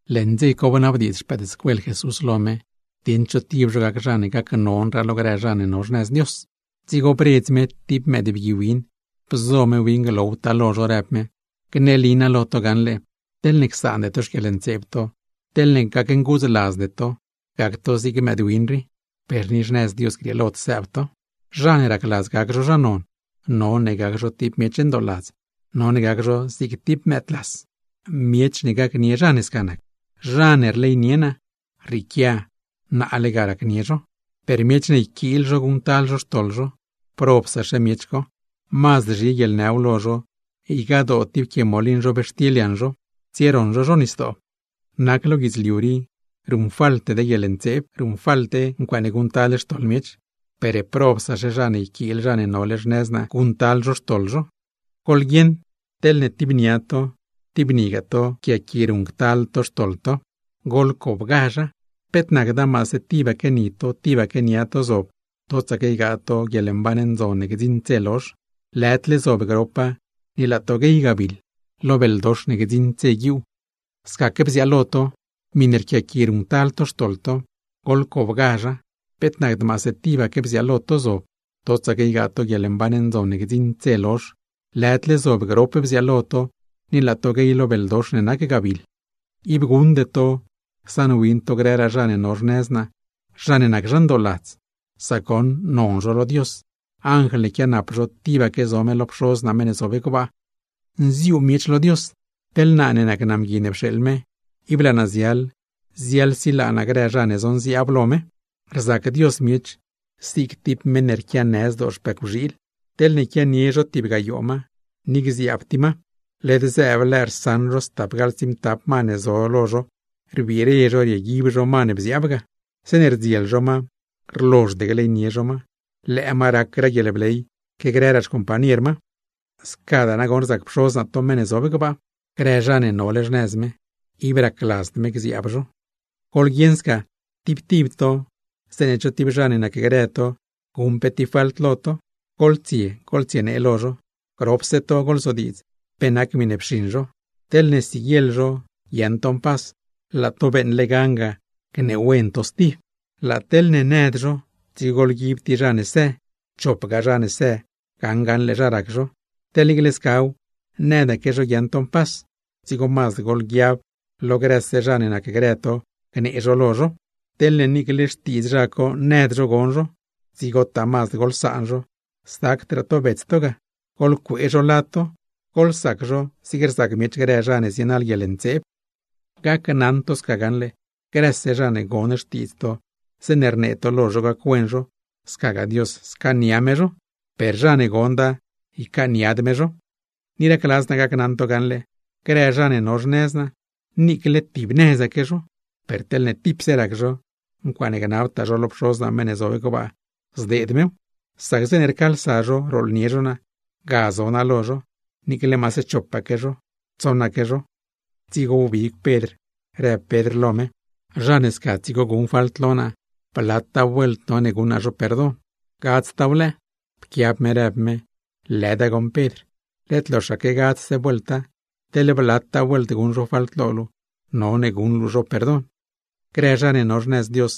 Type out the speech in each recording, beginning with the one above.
Leṉ dze co bnabdiidz xpëëdscuel Jesús lo me, dieṉ cho tib zho gac zha ne mazdraa gacnon lo grë zha ne no xnëz Dios. Dzigo bredz me tib mëëdbgui win, bzo me win glowtaa lo zho, rëb me: ―Gneli naa lo to gaṉle, teḻne csaande to xquieḻntseeb to, teḻne gacnguudzladzde to, gac to zig mëëdwin rii, per ni xnëz Dios grieelod sëëb to. Zha ne racladz gac zho zha non, none gac zho tib miech ndooladz, none gac zho zig tib mëëdlas. Miech ne gacnie zha ne sca nac, zha ne rleynie naa, rrieequia naale ga racnie zho. ’Per miech ne yquiil zho guṉctal zho xtoḻ zho, ¡probsaxe zha co! Mazd zhi guieḻnëw lo zho ygadoo tib quie molin zhobxtil yaṉ zho tsieroṉ zho zho nisdoo. ¡Nac lo guidzliu rii, ruṉfalte guieḻntseeb low! Ruṉfalte ncuaaṉe guṉctal xtoḻ miech, ¡per probsaxe zha ne yquiil zha ne nole xnëz naa, guṉctal zho xtoḻ zho! ’Goḻguieṉ teḻne tib nia to, tib nigaa to rquiaqui ruṉctal to xtoḻ to, goḻtichegazha. Peet nacda maase tibaque ni to, tibaque nia to zob totsaque ygaa to guieḻmban ndzon ne gdziṉd dze lozh, lëdle zob gropa ni laa to guey gabiḻ, lo beldox ne gdziṉd dze guiuu. Scaque bziaalo to, miṉe rquiaqui ruṉctal to xtoḻ to, goḻtichegazha, peet nacd maase tibaque lo to zob totsaque ygaa to guieḻmban ndzon ne gdziṉd dze lozh, lëdle zob gropa ni laa to guey lo beldox ne nac gabiḻ. ’Ib guṉde to csaṉwin to grëraa zha ne no xnëz naa, zha ne nac zha mban, sac goṉ non zho lo Dios, anjl ne quianap zho, tibaque zo me lo Pxoz naa meṉ ne zob gbaa. ’Nziuu miech lo Dios, teḻ naa ne nac naa Mgui ne pxeeḻ me, ib laa naa ziaḻ ziaḻsilaa naa grë zha ne zonziaab lo me. ’Rzac Dios miech zig tib meṉ ne rquianë zdoo xpëcwxiil. Teḻne quianie zho tib gayoo ma, ni gziaab tib ma, led zëëb lëë rsaṉ zho stapgaḻ tsiimtap ma ne zo lo zho, rbire zho rieguib zho ma ne bziaab ga. Zeeṉe rdziel ma lo zho, rlozhd gleynie zho ma, lëë ma rac guieḻbley que grëraa xcompañer ma. Scadaa nagoṉ rzac Pxoz naa miech, grë zha ne nole xnëz me, ib racladzd me gziaab zho. ’Goḻguieṉ sca, tib tib to zeeṉe cho tib zha ne nacgrë to guṉ pe tib falt lo to, goḻtsie goḻtsienee lo zho; gropse to goḻzodiidz pe nac miṉe pxiṉ zho. Teḻne siguieḻ zho guiaaṉ to mpas, laa to beeṉle gan ga gneewen to stib. Laa teḻne nëd zho, dzigo goḻguib tib zha ne së, chopgaa zha ne së gaṉ gaṉle zha rac zho. Teḻ niicle scaw nëdaque zho guiaaṉ to mpas, dzigo mazd goḻguiab lo grëse zha ne nacgrë to gnee zho lo zho. Teḻne niicle xtiidz zha co nëd zho gon zho, dzigotaa mazd goḻsaan zho, sacdraa to bets to ga, goḻcuee zho lad to, goḻsac zho zig rzac miech grë zha ne zienaḻ guieḻntseeb. ’Gneli naa lo to gaṉle, grëse zha ne gon xtiidz to zeeṉe rnee to lo zho gac-wen zho, scagaa Dios scaania me zho; per zha ne gonda, ycaaniad me zho. ’Ni racladz naa gacnaṉ to gaṉle, grë zha ne no xnëz naa, niicle tib nëzaque zho, per teḻne tipse rac zho, ncuaaṉe gnabtaa zho lo Pxoz naa meṉ ne zob gbaa, zdeed mew. Sac zeeṉe rcaalsa zho rooḻnie zho naa, ga zo naa lo zho; niicle maase chopaque, tsoṉaque zho. Dzigo wbig Pedr rëb Pedr lo me: ―Zha ne sca dzigo guṉ falt lo naa, ¿blataa vuelt no guṉ naa zho perdon? ¿Gadztaaw lëë? Pquiab me rëb me: ―Lëda goṉ Pedr, led loxaque gadzdse vuelta. Teḻ blataa vuelt guṉ zho falt lo luu, none guṉ luu zho perdon. ’Grë zha ne no xnëz Dios,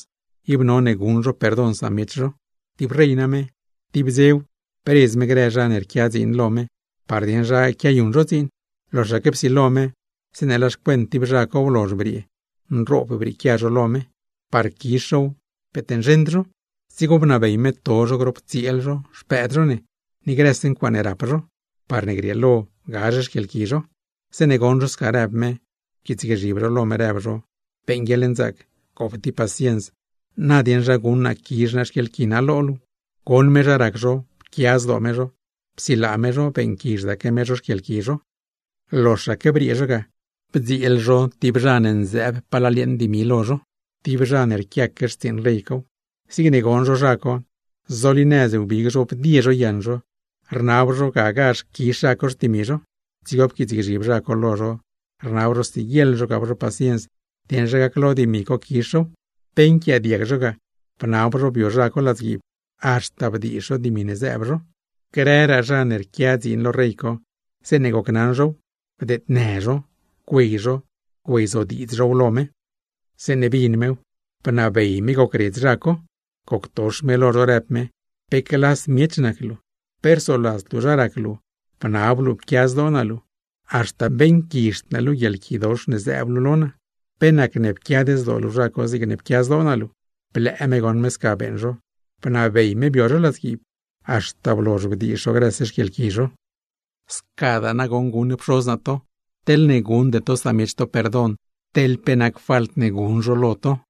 ib none guṉ zho perdon samiech zho. ’Tib rey name, tib dzew bredz me grë zha ne rquia dziin lo me, par dieṉ zha quiayuṉ zho dziin. Loxaque psilo me, zeeṉe laa xcuent tib zha co blozh briee, nroob brieequia zho lo me; par quizh zhow, peet nzheṉd zho. Dzigo bnabey me to zho grop tsieel zho, xpëëd zho ne, ni grëse ncuaaṉe rap zho, parne grieelo gazh xquieḻqui zho. Zeeṉe goṉ zho sca rëb me, pquiitsgzhib zho lo me, rëb zho: “¡Beeṉ guieḻnzaac, gop tib paciens, na dieṉ zha guṉ naa quizh naa xquieḻqui naa lo luu!” Goṉ me zha rac zho, pquia zdoo me zho, psilaa me zho, beeṉquizhdaque me zho xquieḻqui zho. ’Loxaque briee zho ga, bdzieel zho tib zha ne nzëëb palal yeeṉ dimi lo zho, tib zha ne rquiaque xtsiiṉ rey cow. Zigne goṉ zho zha co, zolinëz wbig zho bdie zho yaṉ zho, rnab zho gagazh quizh zho xtimi zho. Dzigo pquiitsgzhib zha co lo zho, rnab zho siguieḻ zho gap zho paciens, dieṉ zha gaclo dimi co quizh zhow. Pe nquiaadiag zho ga, bnab zho bio zha co ladzguiib, haxta bdiizh zho dimi ne zëëb zho ga. Grëraa zha ne rquia dziin lo rey co, zeeṉ gocnaṉ zhow, bdeednë zho, güey zho güeyzodiidz zhow lo me. Zeeṉe bin mew, bnabey me gocredz zho, goctox me lo zho rëb me: “¡Pe clas miech nac luu! Pe rsoladzd luu zha rac luu bnab luu pquia zdoo naa luu, haxta beeṉquizhd naa luu guieḻquidox ne zëëb luu ga. ¿Pe nacne pquiad zdoo luu zha co, zigne pquia zdoo naa luu?” Blëë me goṉ me sca beeṉ zho, bnabey me bio zho ladzguiib, haxta blozh bdiizh zho grëse xquieḻqui zho. ’Scadaa nagoṉ guṉ Pxoz naa to, teḻne guṉde to samiech to perdon, teḻ pe nac falt ne guṉ zho lo to.